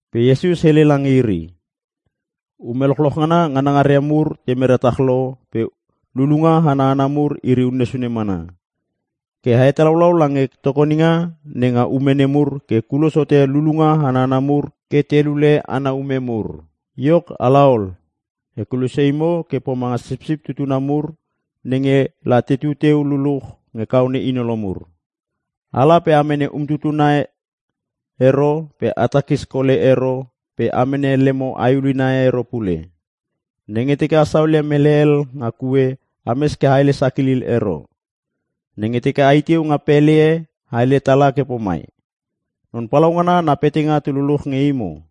Pe Iesus hele lange iri, “Ume lochloch ngana nganangaria mur te mera tach lo pe lulunga ana hana mur iri unne sune mana. Ke a hetalaulau lange tokoninga nenga ume nemur ke kulos hote lulunga ana hana mur ke te lule ana ume mur. Iok ala ol! E kulosia imo ke a pomanga sipsip tutuna mur nenge la tetu teu luluch nge kaone inolo mur. Ala pe a mene umtutuna ero pe a takis kole ero pe a mene lemo ae ulina e ero pule. Nenge teke a saolia mele hel nga kue ames ke a hele sakilil ero. Nenge teke ai teu nga pele e a hele tala ke pomai, ‘Non Palaungana na petanga tu luluch nge imo.’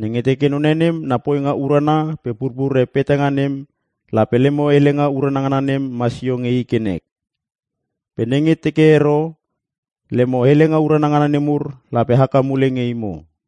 Nenge teke none nem na poinga urana pe purpure petanga nem lape lemo helenga urana ngana nem masio nge i ke nek. Pe nenge teke ero, lemo helenga urana ngana nemur lape haka mule nge imo.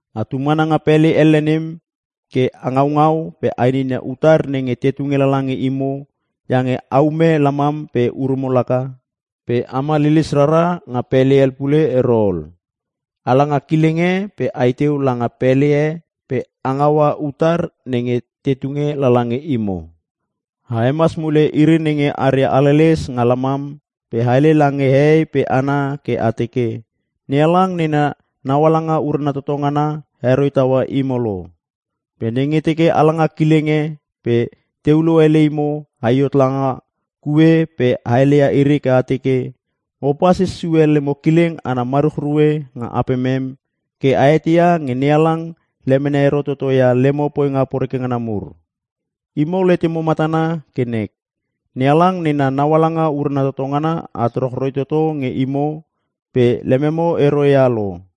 Atu mana nga pele elle nem ke a ngaungau pe a ininia utar nenge te tunge lala nge imo iange a ume lamam pe urumo laka. Pe ama lilis rara nga pele hel pule ero ol. Ala nga kileng e pe ai teu langa pele e pe a ngaua utar nenge te tunge lala nge imo. A hemas mule iri nenge aria haleles nga lamam pe a hele lange hehei pe hana ke a teke, ‘NeHalang nena naualanga urana toto ngana heroi taua imo lo.’ Pe nenge teke a langa kileng e pe te ulo ele imo ai hot langa kue pe a heleia iri ke a teke, ‘Mo pasis sue lemo kileng ana maruchrue nga apemem ke a eteia nge NeHalang lemene ero toto ia lemo poinga poreke ngana mur. Imo letemo matana ke nek, NeHalang nena naualanga urana toto ngana at rochroi toto nge imo pe lememo ero ia lo!’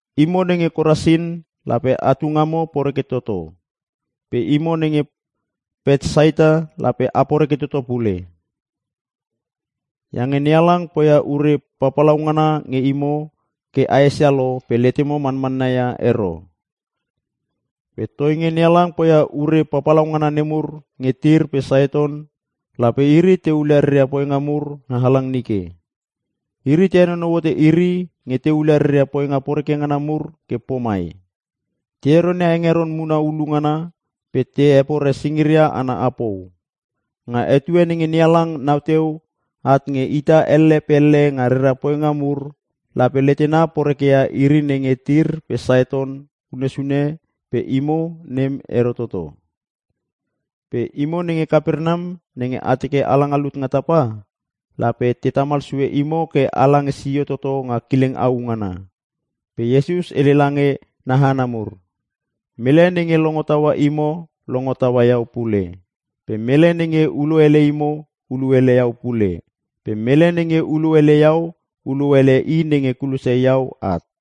“Imo nenge Korasin lape atu ngamo poreke toto! Pe imo nenge Petsaita lape a poreke toto pule! Iange NeHalang poia ure papalaungana nge imo ke a esia lo pe letemo manmanna ia ero. Pe toinge NeHalang poia ure papalaungana nemur nge Tir pe Siton lape iri te hulia reria poinga mur nga halang nike. Iri te henonou hote iri nge te hulia reria poinga poreke ngana mur ke pomai; te heronia hengeron muna hulu ngana pe te hepore singiria ana apou! Nga etue nenge NeHalang nau teu at nge ita elle pe elle nga rera poinga mur lape letena poreke ia iri nenge Tir pe Siton unne sune pe imo nem ero toto. Pe imo nenge Kapernam nenge a teke ala nga lut nga tapa. Lape te tamal sue imo ke ala nge sio toto nga kileng au ngana!” Iesus hele lange na hana mur, “Mele nenge longo taua imo longo taua iau pule pe mele nenge ulo ele imo ulo ele iau pule pe mele nenge ulo ele iau ulo ele I nenge kulosia iau at.”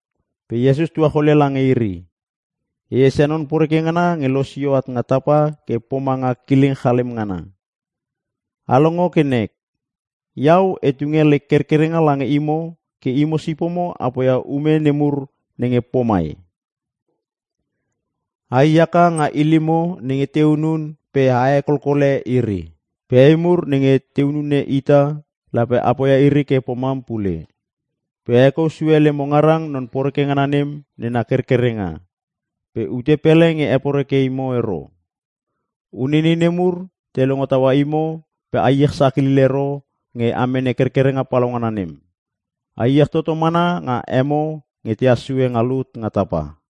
Pe Iesus tuacholia lange iri, “E esia non poreke ngana nge losio at nga tapa ke pomanga kileng chalem ngana. A longo ke nek! Iau e tunge lek kerkerenga lange imo ke imo sipomo a poia ume nemur nenge pomai. Ai haka nga ilimo nenge te hunun pe a hekolkole iri. Pe ei mur nenge te hunun ita, lape apoia iri ke pomam pule. Pe a hekou sue lemo ngarang Non Poreke ngana nem nena kerkerenga. Pe ute pele nge heporeke imo ero. Uneinei ne mur te longo taua imo pe a iech sakilil ero nge a mene kerkerenga palaungana nem. A iech toto mana nga emo nge tehas sue nga lut nga tapa.”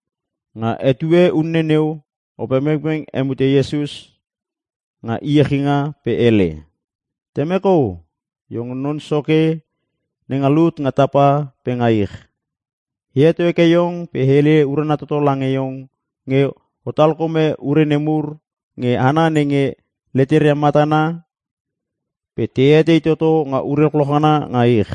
Nga etue unne neu Opepengpeng hemute Iesus nga iechinga pe hele, “Temek O! Iong Non Soke nenga lut nga tapa pe nga ich! E heto heke iong pe e hele urana toto lange iong nge o talkome ure nemur nge hana nenge leteria matana pe te etei toto nga ure lochloch ngana nga ich.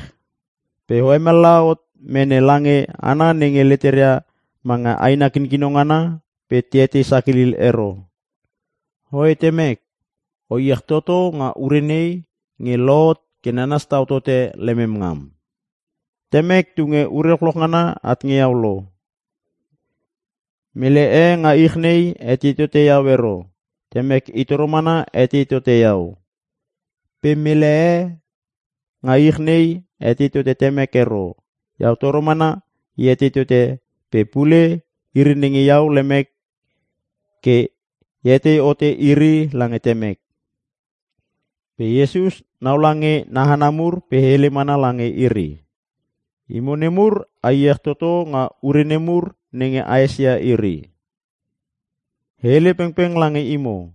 Pe O hemallaha hot mene lange hana nenge leteria manga aina kinkino ngana pe te etei sakilil ero. Oe Temek, o iech toto nga ure nei nge lohot ke nanas tau tote lemem ngam. “Temek tunge ure lochloch ngana at nge iau lo. Mele e nga ich nei etei tote iau ero, Temek i toro mana etei tote iau. Pe mele e nga ich nei etei tote Temek ero, iau toro mana e etei tote pe pule iri nenge iau lemek ke e hetei hote iri lange Temek.” Pe Iesus naula nga na hana mur pe hele mana lange iri, “Imo nemur a iech toto nga ure ne mur nenge aesia iri! E hele pengpeng lange imo.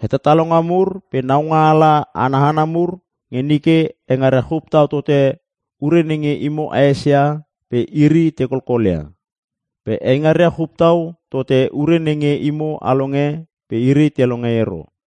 Hetalalonga mur pe naungaala ana hana mur nge nike eingaria chup tau tote ure nenge imo aesia pe iri te kolkolia. Pe eingaria chup tau tote ure nenge imo a longe pe iri te longe ero.”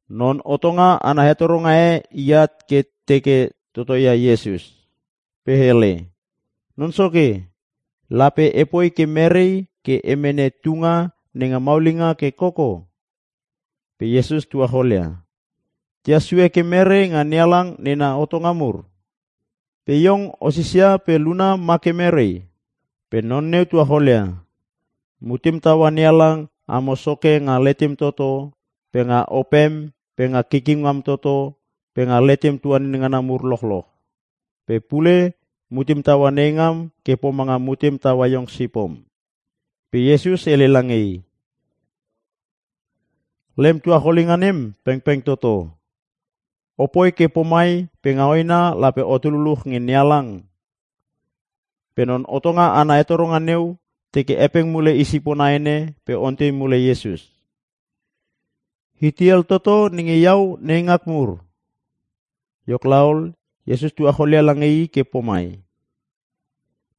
Non hotonga ana hetoronga e iat ke teke totoia Iesus. Pe hele, “Non Soke, lape epoi ke merei ke e mene tunga nenga maulinga ke koko?” Pe Iesus tuacholia, “Tehas sue ke mere nga NeHalang nena hotonga mur? Pe iong o sisia pe luna ma ke mere?” Pe Non neu tuacholia, “Mutem taua NeHalang amo Soke nga letem toto pe nga opem pe nga kikim ngam toto pe nga letem tuanin ngana mur lochloch. Pe pule mutem taua neingam ke pomanga mutem taua iong sipom.” Pe Iesus hele lange i, “Lem tuacholinga nem pengpeng toto. Opoi ke pomai pe nga hoena lape otu luluch nge NeHalang.” Pe non hotonga ana hetoronga neu teke hepeng mule i sipona ene pe ontei mule Iesus, “Itei hel toto nenge iau neingak mur?” Iok laol, Iesus tuacholia lange i ke pomai,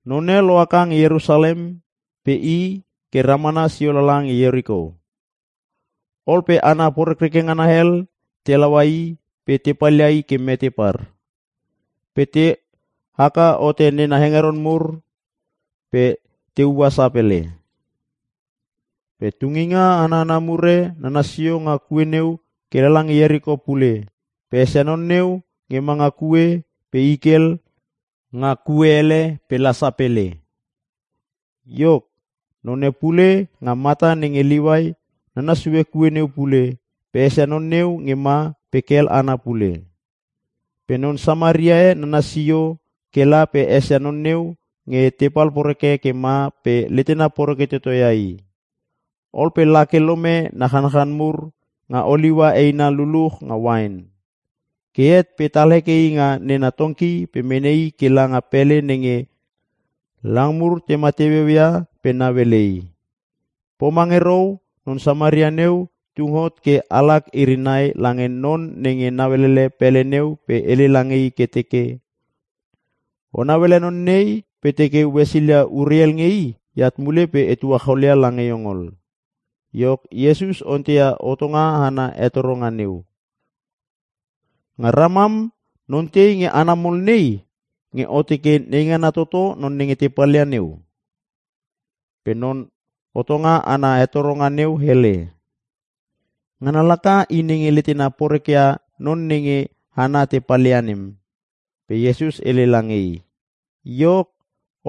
“None lohaka nge Ierusalem pe i ke ramana sio lala nge Ieriko. Ol pe hana porekreke ngana hel te laua i pe te palia i ke mete par. Pe te haka hote nena hengeron mur pe te ua sapele. Pe tunginga ana hana mur e nanas sio nga kue neu ke lala nge Ieriko pule pe esia non neu nge ma nga kue pe i kel nga kue ele pe la sapele. Iok, none pule nge mata nenge Liuai nanas sue kue neu pule pe esia non neu nge ma pe kel ana pule. Pe non Samaria e nanas sio ke la pe esia non neu nge tepal poreke ke ma pe letena poreke toto ia i. Ol pe lake lome na chanchan mur nga oliua eina luluch nga uain. Ke het pe tal heke i nga nena tongki pe mene i ke langa pele nenge lang mur tema teueu ia pe nauele i. Pomange rou non Samaria neu tung hot ke alak iri nai lange non nenge nauelele pele neu pe hele lange i ke teke, ‘O nauele non nei pe teke o hesilia ure hel nge i eat mule pe e tuacholia lange iong ol.’” Iok, Iesus onteia hotonga ana hetoronga neu, “Nga ramam non tei nge hana mol nei nge o teke neingana toto non nenge te palia neu?” Pe non hotonga ana hetoronga neu hele, “Ngana laka i nenge letena porekeia non nenge hana te palia nem.” Pe Iesus hele lange i, “Iok,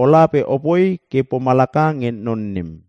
Ola pe opoi ke pomalaka nge non nem.”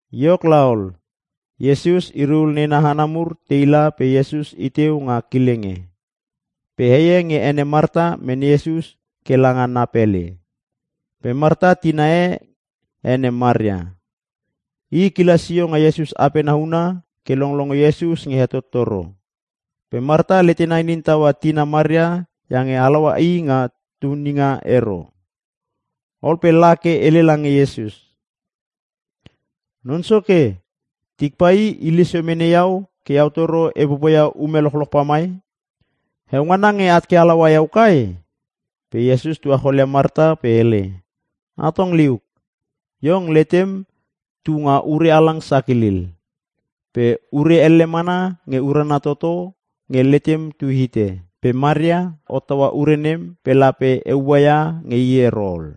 Iok laol, Iesus iri ul nena hana mur teila pe Iesus iteu nga kileng e. Pe heie ene Marta mene Iesus ke langa na pele. Pe Marta tina e ene Maria. I kila sio nga Iesus apena huna ke longlongo Iesus nge hetottoro. Pe Marta letena inin taua tina Maria iange halaua i nga tuninga ero. Ol pe la ke hele lange Iesus, “Non Soke, tik pai hile sio mene iau ke iau toro e popoia ume lochloch pamai. Heongana nge at ke halaua iau kai?” Pe Iesus tuacholia Marta pe hele, “Atong liuk, iong letem tu nga ure halang sakilil. Pe ure elle mana nge urana toto nge letem tu hite. Pe Maria hottaua ure nem pe lape e ua ia nge i ero ol.”